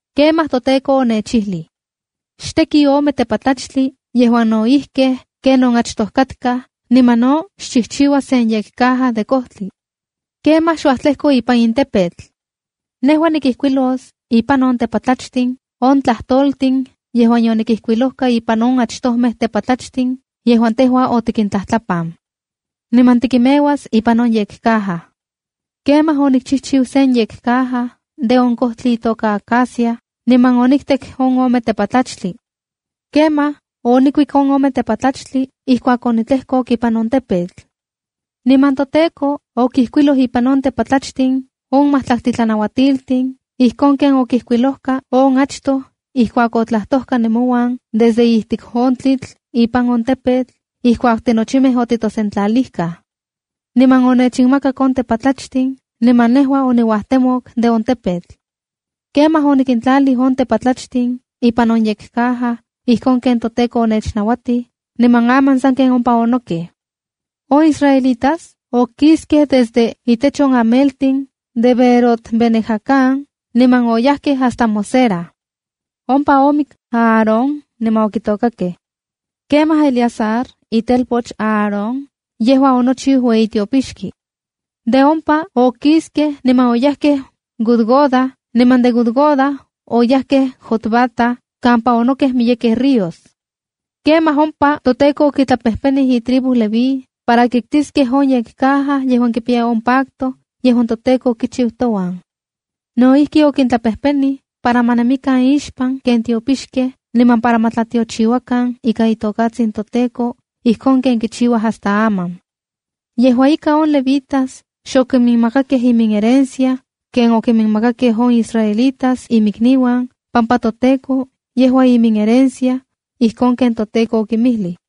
Kemaj toTEKO onechijlij: “Xteki ome tepatlachtli yejuan no ijkij ken on achtoj katkaj, niman no xchijchiua sen yekcaja de kojtli. Kemaj xuajtlejko ipan in tepetl. Nejua nikijkuilos ipan on tepatlachtli on tlajtoltin yejuan yonikijkuilojka ipan on achtojmej tepatlachtin, yejuan tejua otikintlajtlapan. Niman tikinmeuas ipan on yekcaja.” ’Kemaj onikchijchiu sen yekcaja de on kojtli itoka acacia, niman oniktek on ome tepatlachtli. Kemaj onikiktik on tepatlachtli ijkuak onitlejkok ipan on tepetl. Niman toTEKO okijkuiloj ipan on tepatlachtli on majtlaktli tlanauatiltin, ijkon ken okijkuilojka on achtoj ijkuak otlajtojka nemouan desde ijtik on tlitl ipan on tepetl ijkuak tinochimej otitosentlalijkaj. Niman onechinmakak on tepatlachtli, niman nejua oniuajtemok de on tepetl. Kemaj onikintlalij on tepatlachtin ipan on yekcaja ijkon ken toTEKO onechnauatij, niman aman sanken ompa onokej. (On israelitas okiskej desde itech on ameltin de Beerot-bene-jaacán, niman oyajkej hasta Mosera. Ompa omik Aarón niman okitokakej. Kemaj Eleazar, itelpoch Aarón, yejua onochiu ueyi tiopixki. De ompa okiskej niman oyajkej Gudgoda, niman de Gudgoda oyajkej Jotbata kampa onokej miyekej ríos. Kemaj ompa toTEKO okitlapejpenij itribu Leví para kiktiskej on yekcaja yejuan kipiya on pacto yejuan toTEKO okichiu touan. No ijki, okintlapejpenij para ma nemikan ixpan ken tiopixkej niman para ma tlatiochiuakan ika itokatsin toTEKO, ijkon ken kichiuaj hasta aman. Yejua ika, on levitas xokiminmakakej iminherencia ken okiminmakakej on israelitas imikniuan, pampa toTEKO yejua iminherencia, ijkon ken toTEKO okinmijlij.)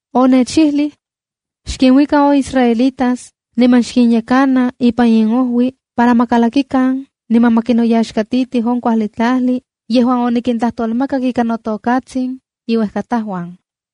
Onechijlij: “Xkinuika on israelitas niman xkinyekana ipan inojui para ma kalakikan niman ma kinoyaxkatitij on kuajli tlajli yejuan onikintlajtolmakak ika notokatsin inuejkatajuan.”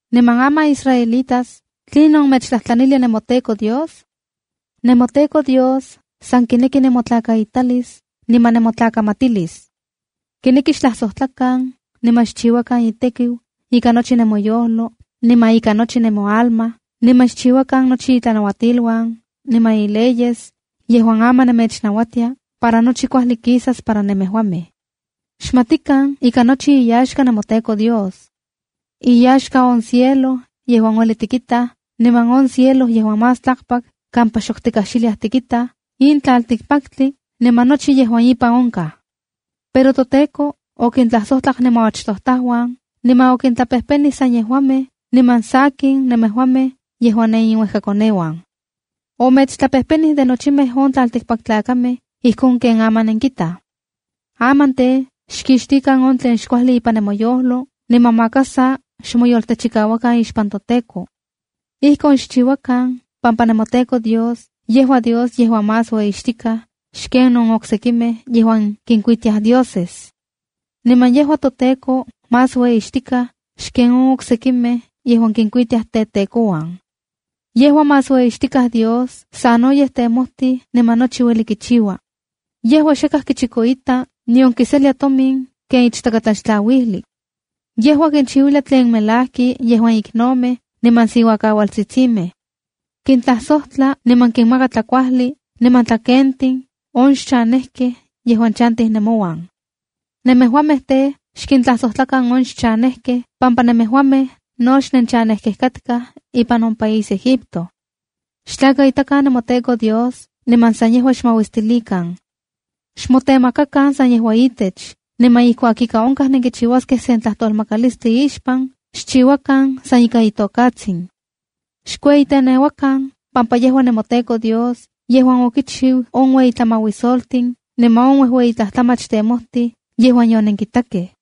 ’Niman aman israelitas, ¿tlinon mechtlajtlanilia nemoTEKO Dios? NemoTEKO Dios, san kineki nemotlakaitalis niman nemotlakamatilis. Kineki xtlajsojtlakan niman xchiuakan itekiu ika nochi nemoyojlo niman ikan nochi nemoalma, niman xchiuakan nochi itlanauatiluan niman ileyes yejuan aman nemechnauatia, para nochi kuajli kisas para nemejuamej. Xmatikan ika nochi iyaxka nemoTEKO Dios. Iyaxka on cielo yejuan ueli tikitaj niman on cielo yejuan más tlakpak kampa xok tikajxiliaj tikitaj, in tlaltikpaktli, niman nochi yejuan ipan onkaj. Pero toTEKO okintlajsojtlak nemoachtojtajuan, niman okintlapejpenij san yejuamej, niman sakin, nemejuamej yejuan neniuejkakoneuan. Omechtlapejpenij de nochimej on tlaltikpaktlakamej ijkon ken aman nenkitaj. ’Aman tej, xkixtikan on tlen xkuajli ipan nemoyojlo, niman maka sa xmoyoltechikauakan ixpan toTEKO. Ijkon xchiuakan pampa nemoTEKO Dios yejua Dios yejuan más ueyixtikaj xken on oksekimej yejuan kinkuitia dioses. Niman yejua toTEKO más ueyixtikaj xken on oksekimej yejuan kinkuitiaj tetekouan. Yejua más ueyixtikaj Dios, sanoyej temojtij niman nochi ueli kichiua. Yejua xakaj kichikoita, nion kiselia tomin ken ichtakatlaxtlauijli. Yejua kinchiuilia tlen melajki yejuan iknomej niman siuakaualtsitsimej. Kintlajsojtla niman kinmaka tlakuajli niman tlakentin on xchanejkej yejuan chantij nemouan. Nemejuamej tej, xkintlajsojtlakan on xchanejkej pampa nemejuamej no xnenchanejkej katkaj ipan on país Egipto. ’Xtlakaitakan nemoTEKO Dios, niman san yejua xmauistilikan. Xmotemakakan san yejua itech, niman ijkuak ika onkaj nenkichiuaskej sen tlajtolmakalislti ixpan, xchiuakan san ika itokatsin. Xkueyiteneuakan pampa yejua nemoTEKO Dios yejuan okichiu on uejueyi tlamauisoltin, niman on uejueyi tlajtlamach temojtij yejuan yonenkitakej.